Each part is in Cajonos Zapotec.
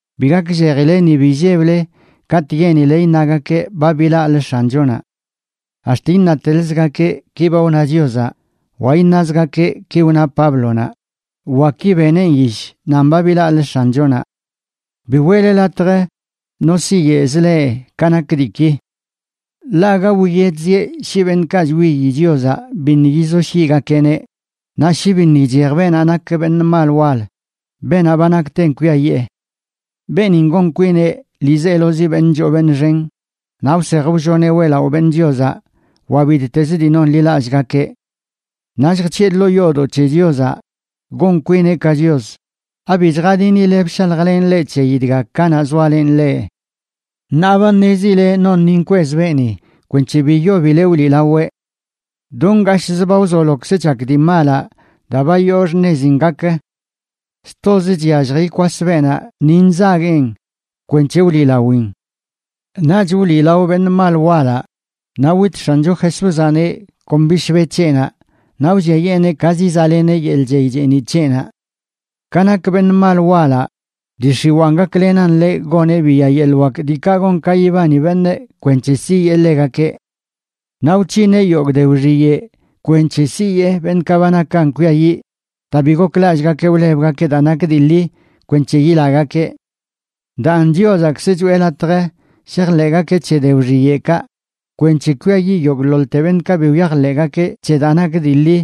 bi gakllejile ni bi illeble katꞌ yenile iṉagakeꞌ ba bilaꞌlə X̱anchonaꞌ. Ax̱t iṉateḻzgakeꞌ: “Ki ba wna Chiozaꞌ”, wa iṉazgakeꞌ: “Ki wna Páblonaꞌ”, wa, “Ki beneꞌn yish nan ba bilaꞌlə X̱anchonaꞌ.” Bi weꞌle latj no siyeꞌzə leꞌ ka nak diiki. Ḻaꞌ aga wiyedzieꞌ shi beṉꞌkaꞌ chwiyi Chiozaꞌ biṉꞌ yizoshyiꞌgakeꞌneꞌ, naꞌ shi biṉꞌ ichej beenaꞌ nak beṉꞌ mal wal,a beenaꞌ ba nakten kwiayee. Beenin gon kwineꞌ ḻiizelozi beṉꞌ choo beṉꞌ xen naꞌ wsej wlloneꞌ weꞌlaꞌo beṉꞌ Chiozaꞌ wa bittezə dii nonḻilallꞌgakeꞌ. Naꞌ lljc̱hiꞌe ḻoo yoodoꞌ c̱he Chiozaꞌ gon kwineꞌ ka Chios. ¿Abi chjadinile bshaljlenꞌ leꞌ c̱heyi dga kanaꞌ zoalenꞌ leꞌ? Ṉaa ba ṉezile non ni nkwez beeni kwenc̱he bi yobileꞌ wliꞌlaweꞌ. Do ngashꞌzə ba wzolokzə chak dii malaꞌ daa ba yoo xṉezin gakə. Stozə chyallj ikwas beenaꞌ ni nzagueꞌn kwenc̱he wliꞌlawin. Naꞌch wliꞌlao beṉꞌ mal walaꞌ, naꞌ wit X̱ancho Jesúzaꞌneꞌ kon bishbe c̱heꞌnaꞌ naꞌ wlliayeeneꞌ ka zizaꞌleneꞌ yeḻꞌ chey cheeniꞌ c̱heꞌnaꞌ. Ka nak beṉꞌ mal walaꞌ, dii x̱iwaan gaklenan ḻeꞌ goneꞌ biya yeḻꞌ wak diikaꞌ gon ka yibani beṉꞌ kwenc̱he siyee ḻegakeꞌ. Naꞌ wc̱hineꞌ yogꞌ de wxiyeꞌ kwenc̱he siyee beṉꞌkaꞌ ba nakan kwiayiꞌ daa bi goklallꞌgakeꞌ wlebgakeꞌ daa nak dii ḻi kwenc̱he yilagakeꞌ. Daan, Chiozaꞌkzə choꞌe latj shajḻeꞌgakeꞌ c̱he de wxiyeꞌkaꞌ, kwenc̱he kwiayiꞌ yogꞌḻoḻte beṉꞌkaꞌ bi wyajḻeꞌgakeꞌ c̱he daa nak dii ḻi,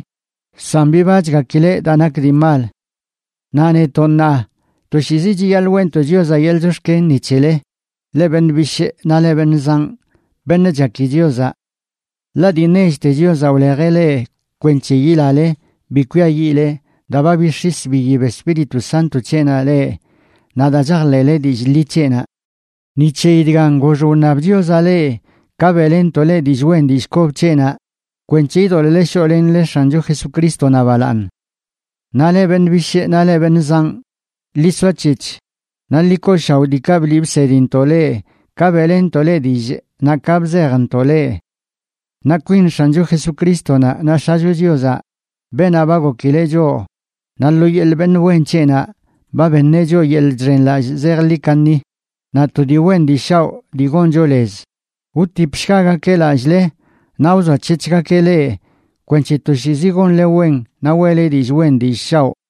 san bibachgakileꞌ daa nak dii mal. Naꞌ netoꞌ ṉaa, toshiizi chiyaḻꞌ weꞌntoꞌ Chiozaꞌ yeḻꞌ chox̱ken ni c̱hele, leꞌ beṉꞌ bishꞌ naꞌ leꞌ beṉꞌ zanꞌ, beṉꞌ chaki Chiozaꞌ. Ḻaꞌ dii nechte Chiozaꞌ wlejeꞌ leꞌ kwenc̱he yilale bi kwiayiꞌle daa ba bix̱is biyib Espíritu Sánto c̱heꞌnaꞌ leꞌ naꞌ daa chajḻeꞌle dillꞌ ḻi c̱heꞌnaꞌ. Ni c̱heyi dgan, gox wṉab Chiozaꞌ leꞌ ka beꞌlenntoꞌ leꞌ dillꞌ wen dillꞌ kob c̱heꞌnaꞌ, kwenc̱he idoḻꞌle shoꞌlenle X̱ancho Jesucrístonaꞌ balaaṉ. Naꞌ leꞌ beṉꞌ bishꞌ naꞌ leꞌ beṉꞌ zanꞌ, ḻi soac̱hec̱h naꞌ ḻi kooshaoꞌ diikaꞌ bliꞌ bsedintoꞌ leꞌ ka beꞌlenntoꞌ leꞌ dillꞌ naꞌ ka bzejntoꞌ leꞌ. Naꞌ kwin X̱ancho Jesucrístonaꞌ naꞌ X̱acho Chiozaꞌ, beenaꞌ ba gokileꞌ choꞌ naꞌ lo yeḻꞌ beṉꞌ wen c̱heꞌnaꞌ ba beṉeꞌ choꞌ yeḻꞌ chxenlallꞌ zejḻi kaṉi naꞌ to dii wen dii shaoꞌ dii goncho lez, wtipshgagakeꞌ lallꞌle naꞌ wzoac̱hec̱hgakeꞌ leꞌ kwenc̱he toshiizi gonle wen naꞌ weꞌle dillꞌ wen dillꞌ shaoꞌ.